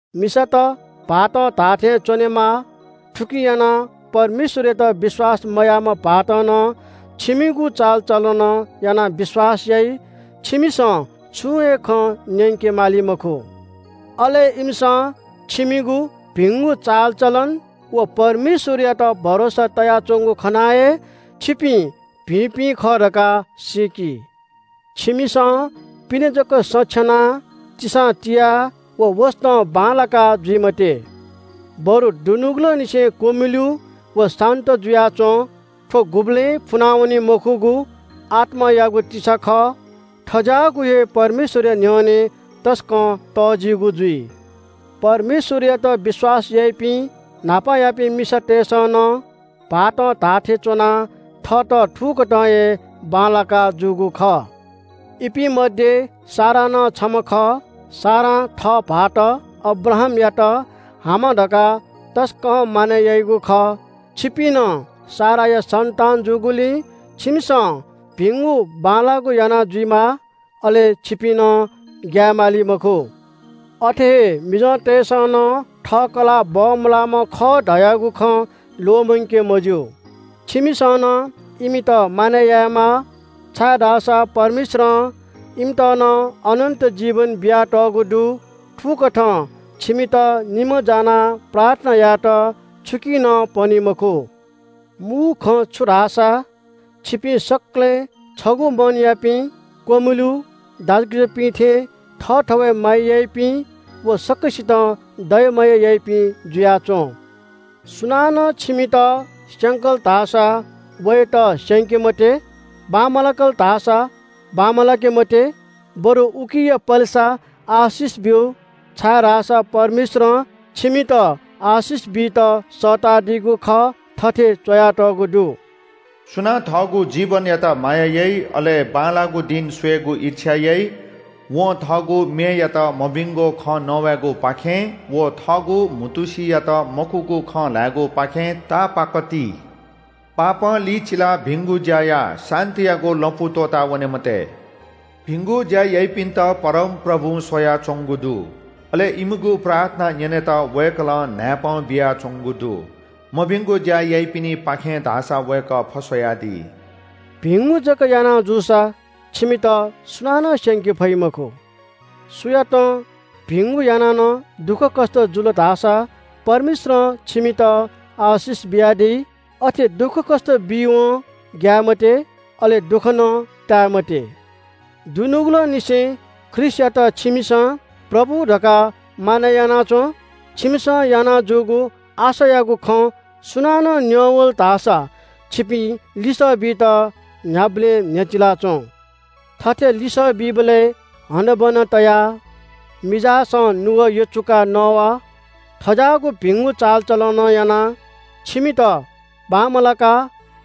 मिसात भाःतं धाःथें च्‍वनेमाः। थुकिं यानाः परमेश्‍वरयात विश्‍वास मयाःम्‍ह भाःतं नं छिमिगु चालचलनं यानाः विश्‍वास याइ। छिमिसं छुं हे खँ न्‍यंके माली मखु। अले इमिसं छिमिगु भिंगु चालचलन व परमेश्‍वरयात भरोसा तयाच्‍वंगु खनाः हे छिपिं भिंपिं खः धकाः सीकी। छिमिसं पिने जक सँ छ्यनाः तिसां तियाः व वसतं बांलाका जुइ मते। बरु दुनुगलंनिसें क्‍वमिलु व शान्‍त जुयाच्‍वँ। थ्‍व गुबलें फुनावनी मखुगु आत्‍मायागु तिसा खः। थज्‍याःगु हे परमेश्‍वरया न्‍ह्यःने तसकं तःजिगु जुइ। परमेश्‍वरयात विश्‍वास याइपिं न्‍हापायापिं मिसातय्‌सं नं भाःतं धाःथें च्‍वनाः थःत थुकथं हे बांलाका जूगु खः। इपिं मध्‍ये सारा नं छम्‍ह खः। सारां थः भाःत अब्राहामयात हामा धकाः तसकं मानय् याइगु खः। छिपिं नं साराया सन्‍तान जूगुलिं छिमिसं भिंगु बांलाःगु याना जुइमाः। अले छिपिं नं ग्‍याये माली मखु। अथे हे मिजंतय्‌सं नं थः कलाः बमलाःम्‍ह खः धयागु खँ ल्‍वःमंके मज्‍यू। छिमिसं नं इमित मानय् यायेमाः, छाय्‌धाःसा परमेश्‍वरं इमित नं अनन्‍त जीवन बियातःगु दु। थुकथं छिमित निम्‍ह जानाः प्रार्थना यायेत छुकिं नं पनी मखु। मू खँ छु धाःसा, छिपिं सकलें छगू मनयापिं, क्‍वमिलु, दाजुकिजापिं थें थःथवय् माया याइपिं व सकसितं दया माया याइपिं जुयाच्‍वँ। सुनानं छिमित स्‍यंकल धाःसा वयात स्‍यंके मते। बांमलाकल धाःसा बांमलाके मते, बरु उकिया पलेसा आशिष ब्‍यु, छाय्‌धाःसा परमेश्‍वरं छिमित आशिष बीत सःतादीगु खः। थथे च्‍वयातःगु दु – “सुयां न्‍ह्यइपुक व ताःई तक म्‍वाये मंदु ला? दुसा, थःगु मेयात मभिंगु खँ नवायेगुपाखें व थःगु म्‍हुतुसियात मखुगु खँ ल्‍हायेगुपाखें तापाक ति। पापं लिचिलाः भिंगु ज्‍या या। शान्‍तियागु लँपु त्‍वःतावने मते। भिंगु ज्‍या याइपिन्‍त परमप्रभुं स्‍वयाच्‍वंगु दु, अले इमिगु प्रार्थना न्‍यनेत वय्‌कलं न्‍हाय्‌पं बियाच्‍वंगु दु, मभिंगु ज्‍या याइपिनिपाखें धाःसा वय्‌कः फस्‍वयादी।” भिंगु जक याना जूसा छिमित सुनानं स्‍यंके फइ मखु। सुयातं भिंगु यानाः नं दुःखकष्‍ट जुल धाःसा परमेश्‍वरं छिमित आशिष बियादी। अथे दुःखकष्‍ट बीवं ग्‍याये मते, अले दुःख नं ताये मते। दुनुगलंनिसें ख्रीष्‍टयात छिमिसं “प्रभु” धकाः मानय् याना च्‍वँ। छिमिसं याना जूगु आशायागु खँ सुनानं न्‍यं वल धाःसा छिपिं लिसः बीत न्‍ह्याबलें न्‍ह्यचिला च्‍वँ। थथे लिसः बीबलय् हनाबना तयाः, मिजासं नुगः यचुकाः नवा। थज्‍याःगु भिंगु चालचलनं यानाः छिमित बांमलाका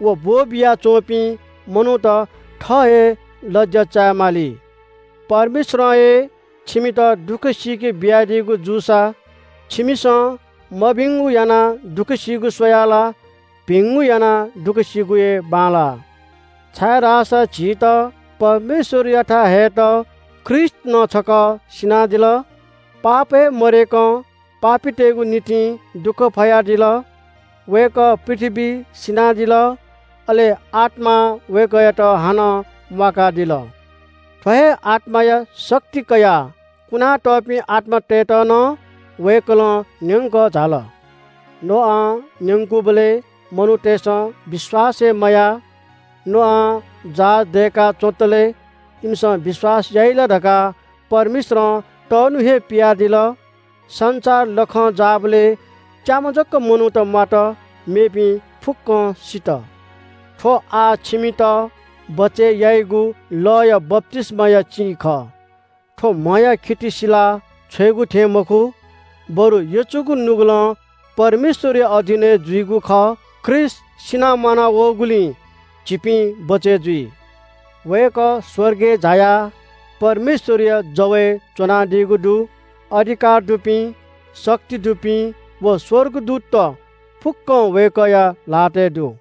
व ब्‍वः बिया च्‍वंपिं मनूत थः हे लज्‍या चाये माली। परमेश्‍वरं हे छिमित दुःख सीके बियादीगु जूसा, छिमिसं मभिंगु यानाः दुःख सीगु स्‍वयाः ला भिंगु यानाः दुःख सीगु हे बांलाः। छाय्‌धाःसा झीत परमेश्‍वरयाथाय् हयेत ख्रीष्‍ट नं छकः सिनादिल। पाप हे मदय्‌कं पापीतय्‌गु निंतिं दुःख फयादिल। वय्‌कः पृथ्‍वीइ सिनादिल, अले आत्‍मां वय्‌कःयात हानं म्‍वाकादिल। थ्‍व हे आत्‍माया शक्ति कयाः कुना तःपिं आत्‍मातय्‌त नं वय्‌कलं न्‍यंकः झाल। नोआं न्‍यंकूबलय् मनूतय्‌सं विश्‍वास हे मयाः। नोआं जहाज दय्‌का च्‍वंतले इमिसं विश्‍वास याइ ला धकाः परमेश्‍वरं तःन्‍हु हे पियादिल। संसार लखं जाःबलय् च्‍याम्‍ह जक मनूत म्‍वात, मेपिं फुक्‍कं सित। थ्‍व आः छिमित बचय् याइगु लःया बप्‍तिस्‍माया चिं खः। थ्‍व म्‍हया खिति सिला छ्वयेगु थें मखु, बरु यचुगु नुगलं परमेश्‍वरया अधीनय् जुइगु खः। ख्रीष्‍ट सिनाः म्‍वाना वःगुलिं झीपिं बचय् जुइ। वय्‌कः स्‍वर्गय् झायाः परमेश्‍वरया जवय् च्‍वनादीगु दु। अधिकार दुपिं, शक्ति दुपिं, व स्‍वर्गदूतत फुक्‍कं वय्‌कःया ल्‍हातय् दु।